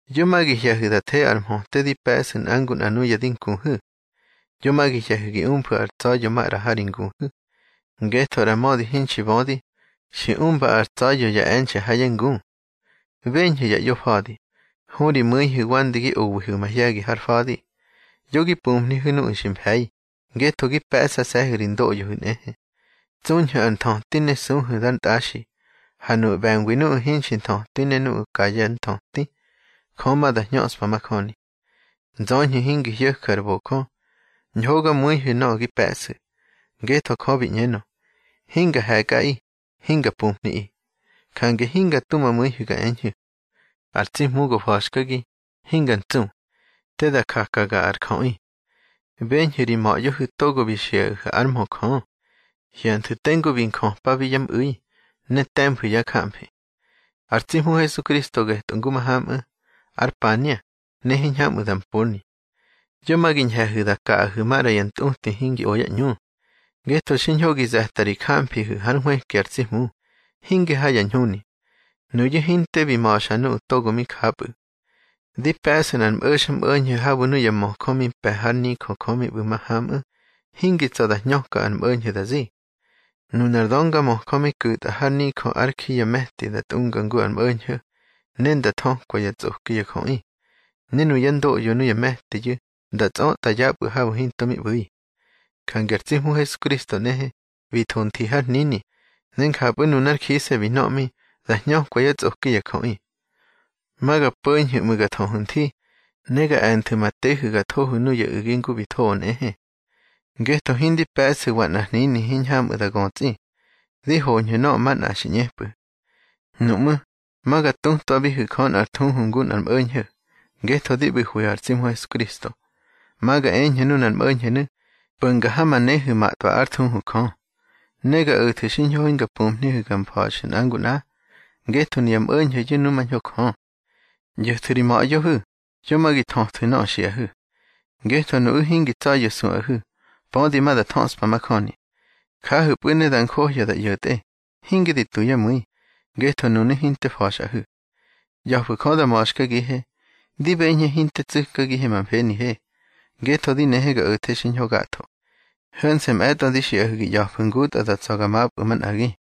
Yo ma gi hye̱hu̱ da the ar mhöte di pe̱ꞌsu̱ nꞌa ngu nꞌa nuya di nkuhu̱. Yo ma gi hye̱hu̱ gi umfu̱ ar tsa̱ya̱ maꞌra ha ri nguhu̱. Ngetho ꞌra mödi hinxi bödi, xi umba ar tsa̱ya̱ ya e̱nxe̱ ha yá ngu. Beñhu̱ ya ꞌyofa̱di, hu ri mu̱ihu̱ wande gi owihu̱ mahye̱gi har fa̱di. Yo gi pumhnihu̱ nuꞌu̱ xi mfe̱i, ngetho gi pe̱ꞌsase̱hu̱ ri ndoꞌyohu̱ nꞌehe. Tsuñhu̱ ar nthöti ne suhu̱ dar ntꞌaxi. Ha nuꞌu̱ ꞌbe̱ngwi nuꞌu̱ hinxi nthötwi ne nuꞌu̱ ka yá nthöti, Jö ma da hñöꞌspa majöni. Nzöñhu̱ hingi hyo̱ju̱ ar bojö, ñhogamu̱ihu̱ nöꞌö gi pe̱ꞌsu̱. Ngetho Jö bi ꞌñenö: Hinga he̱kꞌaꞌi, hinga pumhniꞌi. Jange hinga tu ma mu̱ihu̱ ga eñhu̱: Ar tsi Hmu go fa̱xkagi, hinga ntsu. Te da jakaga ar jöꞌi. Beñhu̱ ri ma̱ꞌyohu̱ togo bi xiꞌahu̱ ár mhö Jö. Hyanthu̱ tengu bi njöpabi yá mꞌu̱i, ne te̱mfu̱ yá jamfi. Ar tsi Hmu Hesukristo getꞌö ngu mahamꞌu̱, ar pania, ne hiñhamꞌu̱ da mponi. Yo ma gi ñhe̱hu̱ da kaꞌahu̱ maꞌra ya ntꞌuti hingi o yá ꞌñu. Ngetho xiñho gi ze̱ta ri jamfihu̱ hár nhwëki ar tsi Hmu, hinge ha ya ñhuni. Nuyu̱ hinte bi ma̱xa nuꞌu̱ togo mi japꞌu̱. Di pe̱ꞌsu̱ nꞌar mꞌo̱xmꞌo̱ñho̱ habu̱ nuya möjö mi mpe̱ hár nijö Jö mi ꞌbu̱ mahamꞌu̱, hingi tsa̱ da hñöka ar mꞌo̱ñho̱ da zi. Nunar döngamöjö mi ku̱tꞌa har nijö ár ji ya me̱ti nda tꞌunga ngu ar mꞌo̱ñho̱, ne nda thökwa yá tsꞌoki ya jöꞌi. Ne nuyá ndoꞌyo nuya me̱tiyu̱ nda tsꞌötꞌa yapꞌu̱ habu̱ hinto mi ꞌbu̱i. Jange ar tsi Hmu Hesukristo nꞌehe, bi tho nthi har hnini, ne njapꞌu̱ nunár jise̱ bi nöꞌmi, da hñökwa yá tsꞌoki ya jöꞌi. Ma ga po̱ñhu̱ ꞌmu̱ ga thöhu̱ nthi, ne ga e̱nthu̱ ma tehu̱ ga thohu̱ nuya u̱gi ngu bi thoꞌö nꞌehe. Ngetho hindi pe̱ꞌsu̱wa nꞌar hnini hiñhamꞌu̱ da götsꞌi. Di hoñhu̱ nöꞌö manꞌa xi ꞌñepꞌu̱. Nuꞌmú̱, ma ga tutwabihu̱ Jö nꞌar thuhu ngu nꞌar mꞌo̱ñho̱, ngetho di ꞌbu̱hwihu̱ ar tsi Hmu Hesukristo. Ma ga eñhu̱ nunar mꞌo̱ñho̱nu̱, po̱nga ha ma nehu̱ matꞌwa ár thuhu Jö. Ne ga o̱thu̱ xiñho hinga pumhnihu̱ ga mfa̱xu̱ nꞌa ngu nꞌa, ngetho nuya mꞌo̱ñho̱yu̱ numañho Jö. ꞌYo̱thu̱ ri ma̱ꞌyohu̱, yo ma gi thöthu̱ nöꞌö xiꞌahu̱. Ngetho nuꞌu̱ hingi tsa̱ya̱ suꞌahu̱, pödi ma da thöꞌspa majöni. Jahu̱pꞌu̱ ne da njohya da ꞌyo̱tꞌe, hinge di tu yá mu̱i, ngetho nunu̱ hinte fa̱xꞌahu̱. ꞌYa̱fu̱ Jö da ma̱xkagihe. Di beñhe hinte tsu̱kagihe ma mfenihe, ngetho di nehe ga o̱the xiñho gatho. Ho̱nse̱ mꞌe̱tꞌo di xiꞌahu̱ gi ꞌya̱fu̱ ngutꞌa da tsa̱ ga mapꞌu̱ manꞌagi.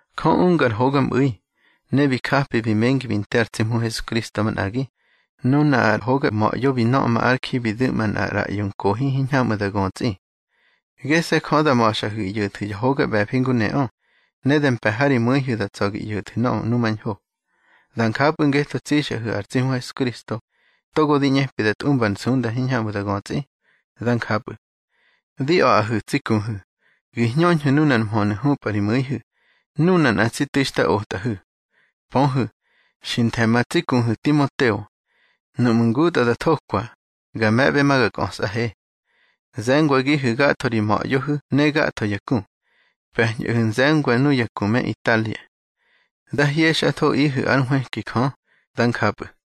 Jö unga ar hogamꞌu̱i, ne bi japi bi mengi bi nte ar tsi Hmu Hesukristo manꞌagi, nuna ar hoga Ma̱ꞌyo bi nöꞌma ár ji bi du̱ꞌma nꞌar ꞌraꞌyo nkohi hiñhamꞌu̱ da götsꞌi. Gese̱ Jö da ma̱xꞌahu̱ gi ꞌyo̱thu̱ ya hoga ꞌbe̱fi ngu neꞌö, ne da mpe̱ ha ri mu̱ihu̱ da tsa̱ gi ꞌyo̱thu̱ nöꞌö numañho. Da njapꞌu̱ ngetho tsixꞌahu̱ ar tsi Hmu Hesukristo, togo di ꞌñepi da tꞌumba ar nsunda hiñhamꞌu̱ da götsꞌi. Dá njapꞌu̱. Di a̱ꞌahu̱ tsi kuhu̱, gi hñöñhu̱ nunar mhönu̱ hupꞌa ri mu̱ihu̱, nuna nꞌa tsi tu̱i xta otꞌahu̱. Pöhu̱, xi nthe̱ ma tsi kuhu̱ Timoteo. Nuꞌmu̱ ngutꞌa da thokwa, ga me̱ꞌbe ma ga kꞌösꞌahe. Ze̱ngwagihu̱ gatho ri ma̱ꞌyohu̱ ne gatho ya ku. Pe̱ñꞌahu̱ nze̱ngwa nuya ku me Italia. Dá hyexꞌathoꞌihu̱ ár nhwëki Jö. Dá njapꞌu̱.